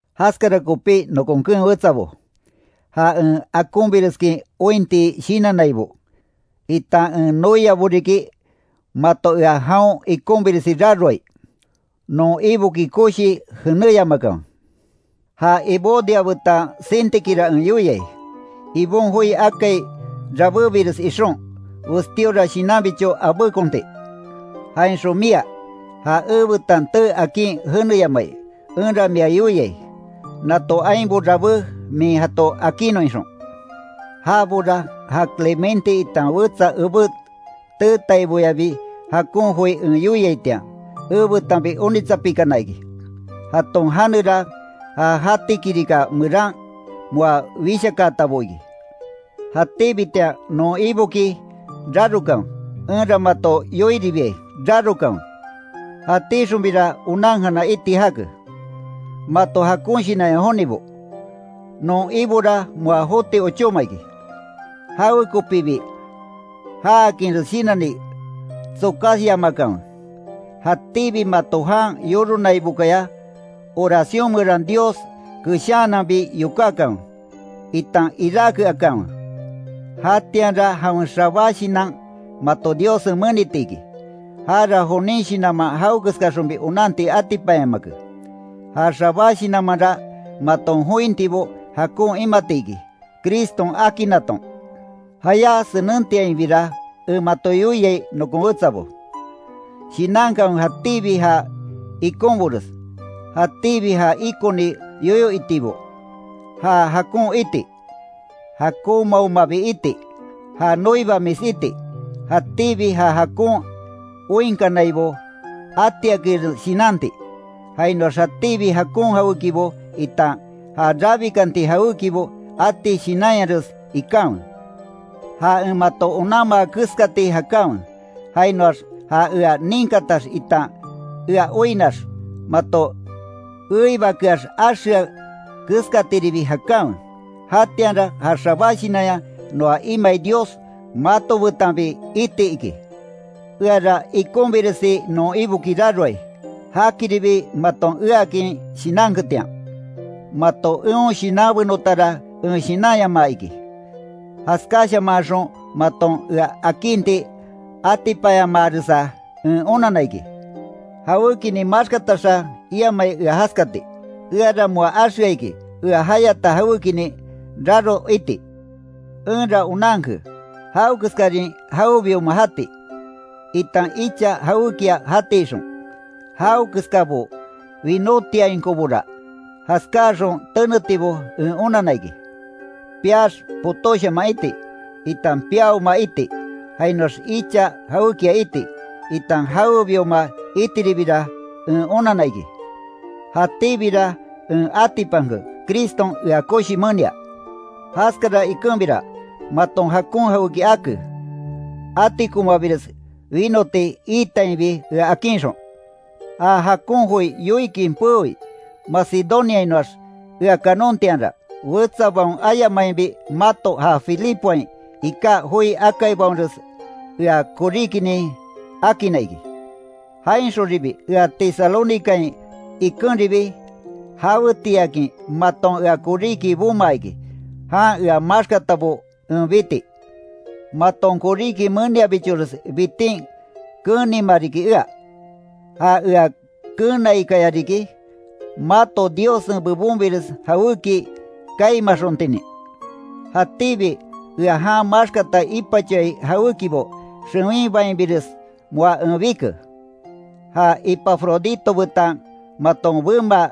Jaskara kopí nokon keen wetsabo, ja en akonbireskin ointi shinannaibo, itan en noiabo riki, mato ea jaon ikonbiresi raroai, non Iboki koshii jenéyamakanwe. Ja Evodia betan Síntiquera en yoiai, Ibon joi akai rabébires ixon, westíora shinanbicho abékonti. Jainxon mia, ja ebetan tee akin jeneyamai, enra mia yoiai; nato ainbo rabé min jato akinnon ixon. Jabora ja Clemente itan wetsa ebé teetaiboyabi jakon joi en yoiaitian, ebetanbi onitsapikana iki. Jaton janera ja jati kirika meran moa wishakaatabo iki. Jatíbitian non Iboki rarokanwe, enra mato yoiribiai: ¡Rarokanwe! Jatíxonbira onankana iti jake, mato jakon shinanya jonibo. Non Ibora moa joti ochóma iki. Jawekopibi jaakinres shinanni tsokasyamakanwe. Jatíbi mato jan yoronaibokaya oración meran Dios keshaananbi yokákanwe, itan iráke akanwe. Jatianra jawen xabá shinan mato Diossen meniti iki. Jara jonin shinanman jawekeskaxonbi onanti atipanyamake. Ja xabá shinanmanra, maton jointibo jakon imati iki Criston akinnaton. Jayá senentiainbira en mato yoiai nokon wetsabo. Shinankanwe jatíbi ja ikonbores, jatíbi ja ikoni yoyo itibo, ja jakon iti, jakonmaomabi iti, ja noibamis iti, jatíbi ja jakon oinkanaibo atiakinres shinanti, jainoax jatíbi jakon jawékibo itan ja rabikanti jawékibo ati shinanyares ikanwe. Ja en mato onanma keskati jakanwe. Jainoax ja ea ninkatax itan ea oinnax mato eibakeax axea keskatiribi jakanwe. Jatianra ja xabá shinanya noa imai Dios mato betanbi iti iki. Eara ikonbiresi non Iboki raroai, jakiribi maton eakin shinanketian. Mato eon shinanbenotara en shinanyamaa iki, jaskáshamanxon maton ea akinti atipanyamaaresa, en onanna iki. Jawékinin maxkataxa iamai ea jaskati, eara moa axea iki ea jayata jawékinin raro iti. Enra onanke, jawekeskarin jawebioma jati, itan icha jawékia jati ixon. Jawekeskabo winótiainkobora, jaskáaxon tenetibo en onanna iki. Piax potóshaman iti, itan piaoma iti, jainoax icha jawékia iti, itan jawebioma itiribira en onanna iki. Jatíbira en atipanke, Criston ea koshi menia. Jaskara ikenbira, maton jakon jawéki ake, atikomabires winoti iitainbi ea akinxon. Ja jakon joi yoikin peoi Macedoniainoax ea kanontianra, wetsabaon ayamainbi mato ja Filipoain iká joi akaibaonres ea koríkinin akinna iki. Jainxonribi ea Tesalónicain ikenribi jawetiiakin maton ea koríki bomaa iki, jan ea maxkatabo en biti. Maton koríki meniabichores bitin keenima riki ea. Ja ea keenaikaya riki, mato Diossen bebonbires jawéki kaimaxontinin. Jatíbi ea jan maxkata ipachoai jawékibo xewinbainbires moa en bike. Ja Epafrodito betan maton bemaa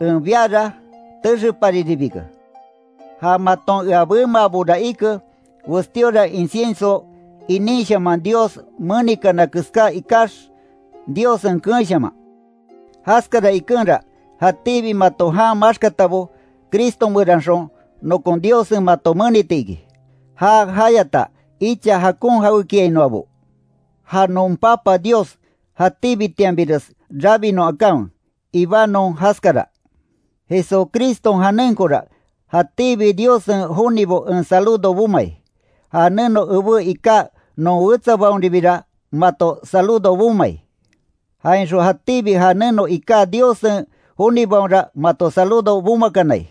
en biara texepariribike. Ja maton ea bemaabora ike, westíora incienso inínshaman Dios menikana keská ikax Diossen keenshaman. Jaskara ikenra jatíbi mato jan maxkatabo, Cristo meranxon, nokon Diossen mato meniti iki, já jayata icha jakon jawékiainoabo. ¡Ja non Papa Dios jatíbitianbires rabinon akanwe! Ibanon jaskara. Jesucriston janenkora jatíbi Diossen jonibo en saludo bomai. Ja neno ebé iká non wetsabaonribira mato saludo bomai. Jainxon jatíbi ja neno iká Diossen jonibaonra mato saludo bomakanai.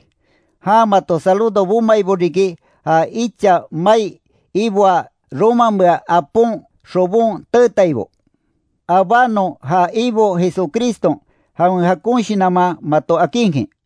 Jan mato saludo bomaibo riki, ja icha mai iboaa romamea apon xobon teetaibo. Abánon ja Ibo Jesucriston jawen jakon shinanman mato akinkin.